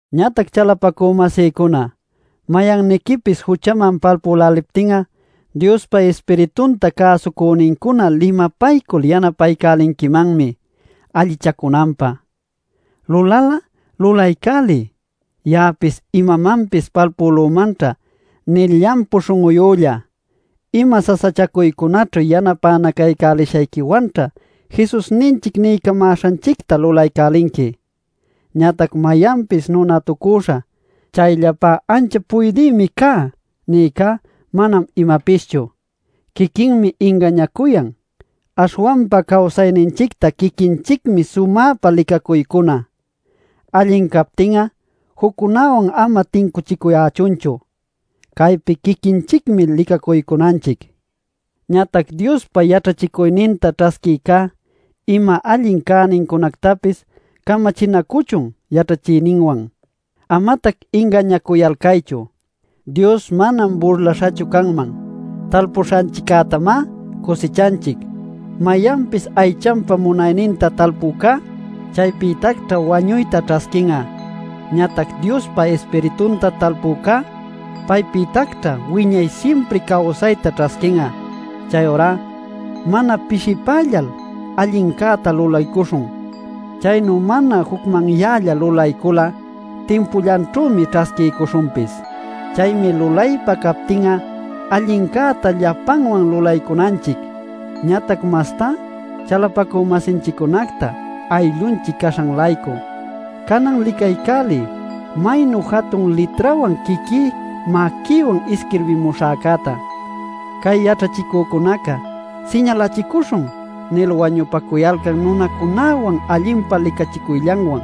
Ñatac chalapacü-masïcuna, mayanniquipis juchaman palpüläliptin'a, Diospa Ispiritunta cäsucünincuna limapaycul yanapaycälinquimanmi allichacunanpä. Lulal'a lulaycäliy “Ya'apis imamanpis palpülümanćha” nil llampu śhun'uyülla. Ima sasachacuycunaćhu yanapänacaycälishayquiwanćha Jesusninchic niycamäśhanchicta lulaycälinqui. Ñatac mayanpis nunatucüśha “Chayllapá anchap puydïmi cá” nïcá manam imapischu; quiquinmi ingañacuyan. Aśhwanpa cawsayninchicta quiquinchicmi sumäpa licacuycuna. Allin captin'a juccunawan ama tincuchicuyächunchu. Caypi quiquinchicmi licacuycunanchic. Ñatac Diospa yaćhachicuyninta ćhasquïcá ima allin cänincunactapis camachinacuchun yaćhachïninwan. Amatac ingañacuyalcaychu: Dios manam burlaśhachu canman. Talpuśhanchiccätamá cusichanchic. Mayanpis aychanpa munayninta talpücá, chaypïtacćha wañuyta ćhasquin'a. Ñatac Diospa Ispiritunta talpücá, paypïtacćha wiñay simpri cawsayta ćhasquin'a. Chayurá mana pishipällal allincäta lulaycuśhun. Chaynu mana jucmanyällal lulaycul'a timpullanćhümi ćhasquiycuśhunpis. Chaymi lulaypa captin'a allincäta llapanwan lulaycunanchic, ñatac mastá chalapacü-masinchiccunacta ayllunchic caśhan-laycu. Canan licaycäliy maynu jatun litrawan quiquí maquïwan isquirbiycamuśhäta: Cay yaćhachicücunaca “siñalachicuśhun” nil wañupacuyalcan nunacunäwan allinpa licachicuyllanwan,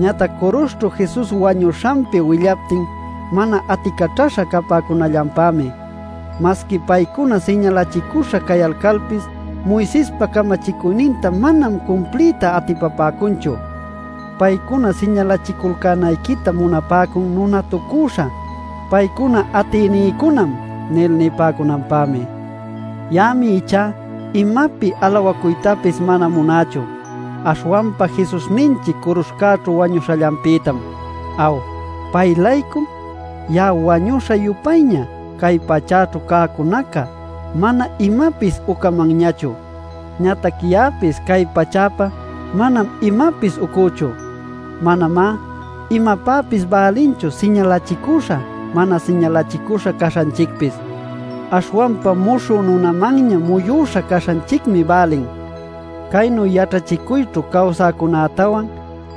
ñatac curuśhćhu Jesus wañuśhanpi willaptin mana aticaćhaśha capäcunallanpämi. Masqui paycuna siñalachicüśha cayalcalpis Moisespa camachicuyninta manam cumpliyta atipapäcunchu. Paycuna siñalachiculcänayquita munapäcun nunatucüśha: “paycuna atïnïcunam” nil nipäcunanpämi. Ya'ami ichá imapi alawacuytapis mana munächu, aśhwanpa Jesusninchic curuśhcäćhu wañuśhallanpïtam. Aw, pay-laycum, ya'a wañüśha-yupayña, cay pachäćhu cäcunaca mana imapis ucamanñachu. Ñatac ya'apis cay pachäpa manam imapis ucüchu. Manamá imapäpis bälinchu siñalachicüśha mana siñalachicüśha caśhanchicpis; aśhwanpa muśhü nunamanña muyuśha caśhanchicmi bälin. Caynu yaćhachicuyćhu cawsäcunätawan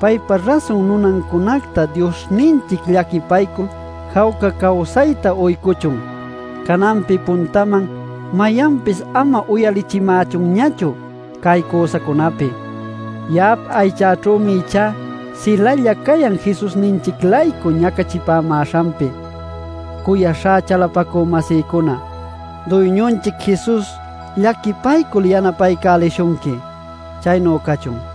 paypa rasun nunancunacta Diosninchic llaquipaycul jawca cawsayta uycuchun. Cananpi puntaman mayanpis ama uyalichimächunñachu cay cüsacunapi; ya'ap aychäćhümi ichá silalla cayan Jesusninchic-laycu ñacachipämäśhanpi. Cuyaśhá chalapacü-masïcuna, Duyñunchic Jesus llaquipaycul yanapaycälishunqui. Chaynu cachun.